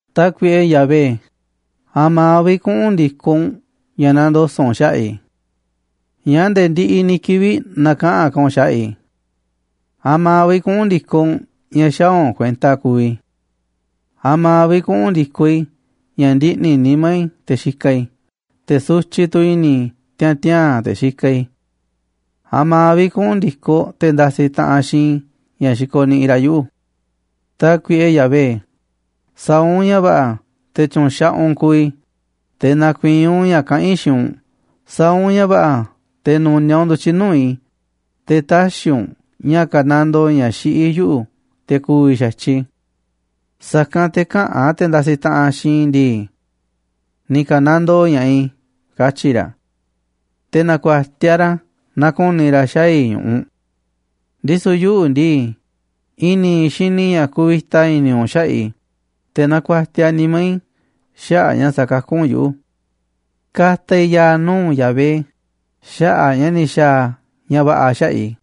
Tákuiꞌe Yahvé, ¿a̱ma̱ vi̱ꞌ kuꞌu̱n ndi̱koꞌ u̱nꞌ ña̱ nandoso̱ꞌ u̱nꞌ xaꞌa̱ꞌ i̱? ¿Ñáá nde̱e̱ ndiꞌiꞌ ni̱ kivi̱ꞌ näkaꞌanꞌ ka̱ u̱nꞌ xaꞌa̱ꞌ i̱? ¿A̱ma̱ vi̱ꞌ kuꞌu̱n ndi̱koꞌ u̱nꞌ ña̱ xäaꞌ u̱nꞌ kuenta kuuꞌ i̱? ¿A̱ma̱ vi̱ꞌ kuꞌu̱n ndi̱koꞌ i̱ ña̱ ndiꞌni̱ nimá i̱, te̱ xikaꞌ i̱, te̱ sutyiꞌ tu̱ i̱ni̱ i̱ tiaa̱n tiaa̱n te̱ xikaꞌ i̱? ¿A̱ma̱ vi̱ꞌ kuꞌu̱n ndi̱koꞌ te̱ ndasiꞌ taꞌanꞌ xiinꞌ i̱ ña̱ xikoniꞌiꞌ ra̱ yuꞌu̱? Tákuiꞌe Yahvé, sa̱a̱ u̱nꞌ ña̱ va̱ꞌa̱ te̱ tyu̱nxaꞌaꞌ u̱nꞌ kuuꞌ i̱, te̱ na̱ku̱i̱i̱n u̱nꞌ ña̱ kaꞌán i̱ xiinꞌ u̱nꞌ. Sa̱a̱ u̱nꞌ ña̱ va̱ꞌa̱ te̱ nu̱niaꞌ u̱nꞌ ndu̱tyiꞌ nuu̱ꞌ i̱, te̱ tä̱xi̱ u̱nꞌ ña̱ ka̱nandoo ña̱ xiꞌí yuꞌu̱ te̱ ku̱vi̱ xa̱tyiꞌ i̱. Sa̱kanꞌ te̱ käꞌa̱n te̱ ndasiꞌ taꞌanꞌ xiinꞌ i̱ ndii: “Ni̱ ka̱nandoo ña̱ꞌaꞌ i̱”, katyi̱ ra̱. Te̱ na̱ku̱a̱tiaꞌ ra̱ naaꞌ ku̱ni̱ ra̱ xaa̱ i̱ ñu̱ꞌuꞌ. Ndisu̱ yuꞌu̱ ndii, i̱ni̱ i̱ xini i̱ ña̱ kuvita i̱ni̱ u̱nꞌ xaꞌa̱ꞌ i̱, te̱ na̱ku̱a̱tiaꞌ nimá i̱ xaꞌa̱ꞌ ña̱ sakakú u̱nꞌ yuꞌu̱. Ka̱ta̱ i̱ ya̱a̱ nuu̱ꞌ Yahvé xaꞌa̱ꞌ a̱ ña̱ ni̱ xa̱a̱ a̱ ña̱ va̱ꞌa̱ xaꞌa̱ꞌ i̱.